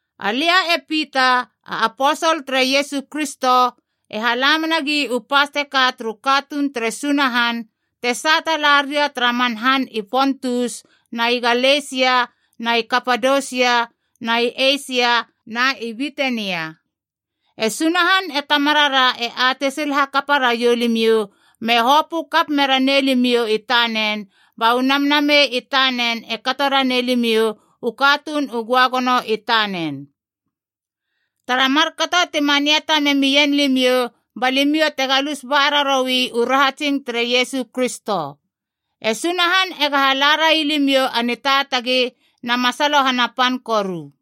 Alia e Pita, a aposol tere Iesu Kristo, e hala menagi u pas teka turu katuun tere Sunahan te sata la ria tara man han i Pontus na i Galesia na i Kapadosia na i Eisia na i Bitenia. E Sunahan e Tamarara e atei sil hakapa raiou limiou me hopö kap mera nei limiou i tanen ba u Namnamei i tanen e kato ranei limiou u katuun u göagono i tanen. Tara markato ti maniata memien limiou, ba limiou te galus raroui u rahatsing tere Iesu Kristo. E Sunahan ega hala rai limiou a nitaatagi na masalohana pan koru.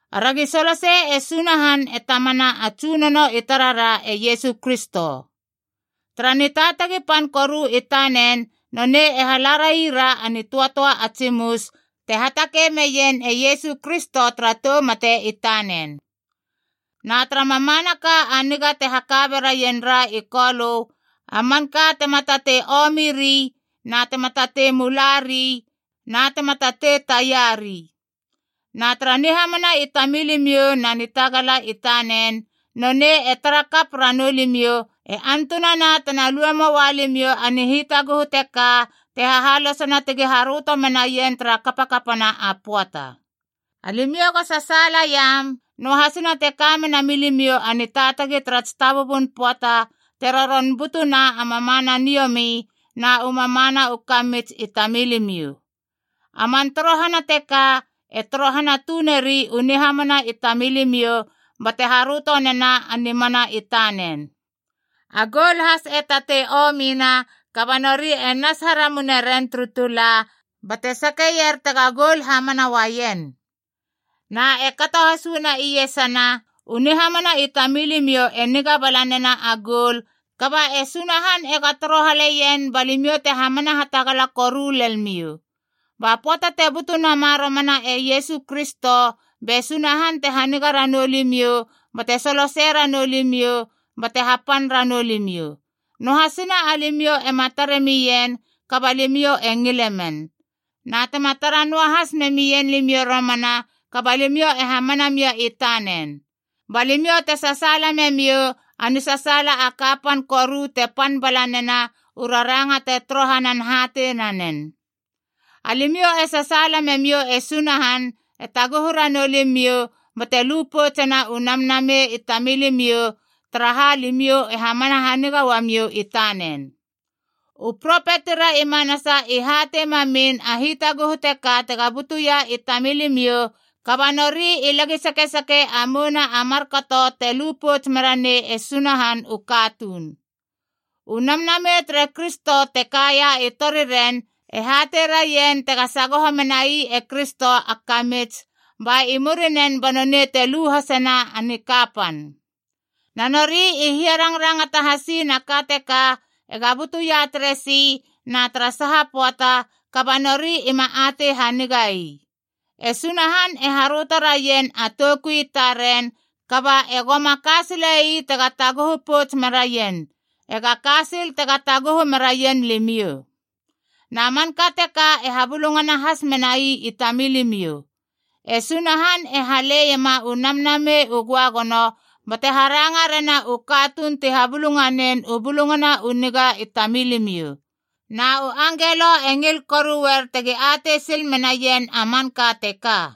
Aragi solosei e Sunahan e Tamana a Tsunono i tarara e Iesu Kristo. Tara nitaatagi pan koru i tanen nonei e hala rai ra a nitöatöa a tsimus te hatakei meien e Iesu Kristo tara tou mate i tanen. Na tara mamanaka a niga te haka beraien ra i Kolö, a manka tema tatei omiri na tema tatei mulari na tema tatei taiari. Na tara nihamana i tamilimiou na nitagala i tanen, nonei e tara kap ranou limiou, e antunana tena lue moua limiou a nihitaguhu teka te hahalosena tegi haröto menaien tara kapakapana a pöata. Alimiou go sasaalaiam, noahasina te ka mena milimiou a nitaatagi tara tsitabubun pöata te roron butuna a mamana niomi na u mamana u kamits i tamilimiou. A man torohana teka, e torohana tuneri u nihamana i tamilimiou, bate haröto nena a nimana i tanen. A goul has e tatei omina, kaba nori e nas haramune ren turu tula bate sakeier tega goul hamana uaien. Na e kato has uana iesana, u nihamana i tamilimiou e niga bala nena a goul, kaba e Sunahan ega torohaleien ba limiou te hamana hatagala koru lel miou. Ba pöata te butu nama romana e Iesu Kristo, be Sunahan te haniga ranou limiou bate solosei ranou limiou bate hapan ranou limiou. Noahasina alimiou ema tare mien, kaba limiou e ngile men. Na tema tara noahas memien limiou i romana, kaba limiou e hamana mia i tanen. Ba limiou te sasaala memiou a nisasaala a kapan koru te pan bala nena u raranga te torohanan hatei nanen. Alimiou e sasaala memiou e Sunahan e taguhu ranou limiou bate lu poutsena u namnamei i tamilimiou, taraha alimiou e hamana haniga uamiou i tanen. U propetira i manasa i hatei mamin a hitaguhu teka tega butuia i tamilimiou, kaba nori i lagi sakesake a mouna a markato te lu pouts mera nei e Sunahan u katuun. U Namnamei tere Kristo te kaia i toriren e hatei raien tega sagoho menai e Kristo a kamits, ba i murinen banonei te lu hasena a nikapan. Na nori i hiarangrangata hasiin a ka teka ega butuia teresi na tara saha pöata, kaba nori ima atei haniga ii. E Sunahan e haröto raien a toukui i taren, kaba egoma ka sile ii tega taguhu pouts meraien, ega ka sil tega taguhu meraien limiou. Na manka teka i habulungana has menai i tamilimiou. E Sunahan e haleiema u Namnamei u Göagono bate haranga rena u katuun ti habulunganen u Bulungana u Niga i tamilimiou. Na u angelo has e ngil koruer tegi atei sil menaien a manka teka.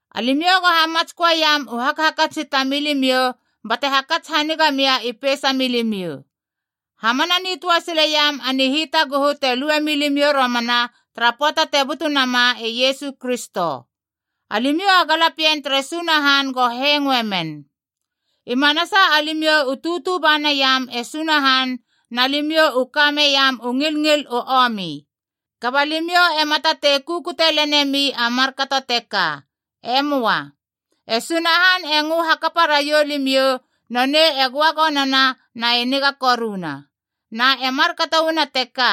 Alimiou go hamatsköeiam u hakhakats i tamilimiou bate hakats haniga mia i peisa milimiou. Hamana nitöa sileiam a nihitaguhu te lue milimiou romana tara pöata te butu nama e Iesu Kristo. Alimiou a galapien tere Sunahan go hengoe men. I manasa alimiou u tutu ba naiam e Sunahan na limiou u ka meiam u ngilngil u omi. Kaba limiou ema tatei kukute lenemi a markato teka. E möa. E Sunahan e ngö hakapa raiou limiou, nonei e göagonona na e niga koruna. Na e markato uana teka,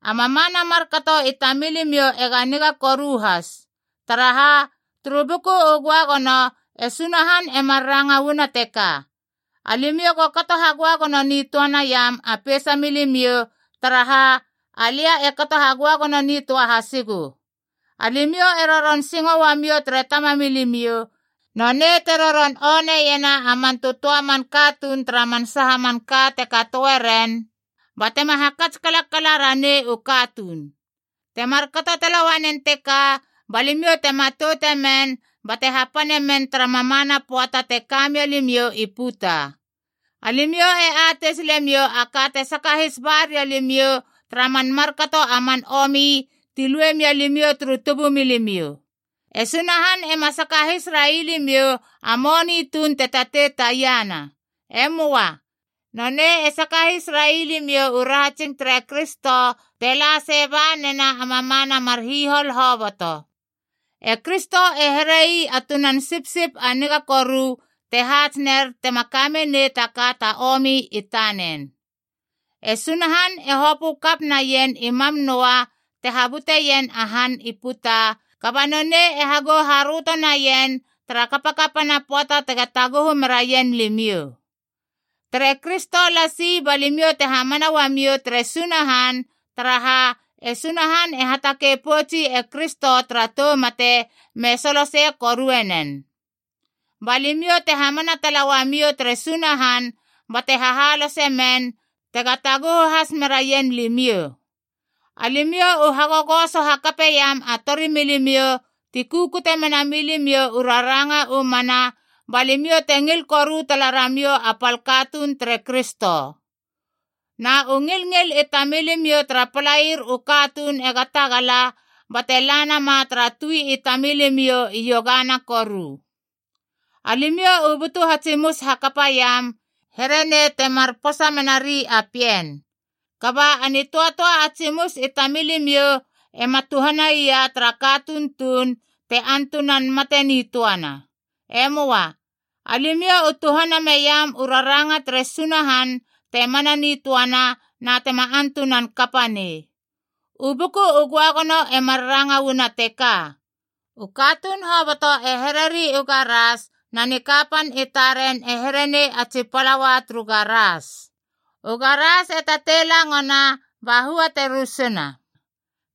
a mamana markato i tamilimiou ega niga koru has. Taraha, turu Buku u Göagono e Sunahan e mar ranga uana teka, “Alimiou go kato hagöagono nitöa naiam a peisa milimiou, taraha alia e kato hagöagono nitöa hasigu.” Alimiou e roron singo uamiou tere Tamamilimiou, nonei te roron oneiena a man tötöa a man katuun tara man saha manka te katoeren, batema hakats kalakala ranei u katuun. Te markato tala uanen teka ba limiou te matoute men bate hapane men tara mamana pöata te ka mia limiou i puta. Alimiou e atei silemiou a ka te sakahis ba ria limiou tara man markato a man omi ti lue mia limiou turu tubumilimiou. E Sunahan ema sakahis rai limiou a moni tuun te tatei taiana. E möa. Nonei e sakahis rai limiou u rahatsing tere Kristo, te la sei ba nena a mamana mar hihol hoboto. E Kristo e here ii a tunan sipsip a niga koru te haats ner tema ka menei taka ta omi i tanen. E Sunahan e hopö kap naien i mam noa te habuteien a han i puta, kaba nonei e hagou haröto naien tara kapakapana pöata tega taguhu meraien limiou. Tere Kristo lasi ba limiou te hamana uamiou tere Sunahan, taraha, e Sunahan te hatakei poutsi e Kristo tara tou mate me solosei korue nen. Ba limiou te hamana tala uamiou tere Sunahan bate hahalose men tega taguhu has meraien limiou. Alimiou u hagogoso hakapeiam a torimilimiou ti kukute mena milimiou u raranga u mana, ba limiou te ngil koru tala ramiou a pal katuun tere Kristo. Na u ngilngil i tamilimiou tara palaier u katuun ega tagala, bate la nama tara tui i tamilimiou iogana koru. Alimiou u butu hatsimus hakapaiam, here nei temar posa menari a pien. Kaba a nitöatöa a tsimus i tamilimiou ema tuhanaia tara katuun tuun te antunan mate nitöana. E möa. Alimiou u tuhana meiam u raranga tere Sunahan te mana nitöana na tema antunan kapa nei. U Buku u Göagono e mar ranga uana teka, “U katuun hoboto e hereri u garas, na nikapan i taren e here nei a tsi palaua turu garas. U garas e tatei langona, ba hua te rusuna.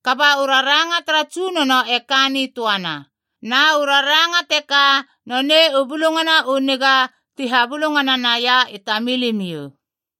Kaba u raranga tara Tsunono e ka nitöana.” Na u raranga teka nonei u Bulungana u Niga ti habulungana naia i tamilimiou.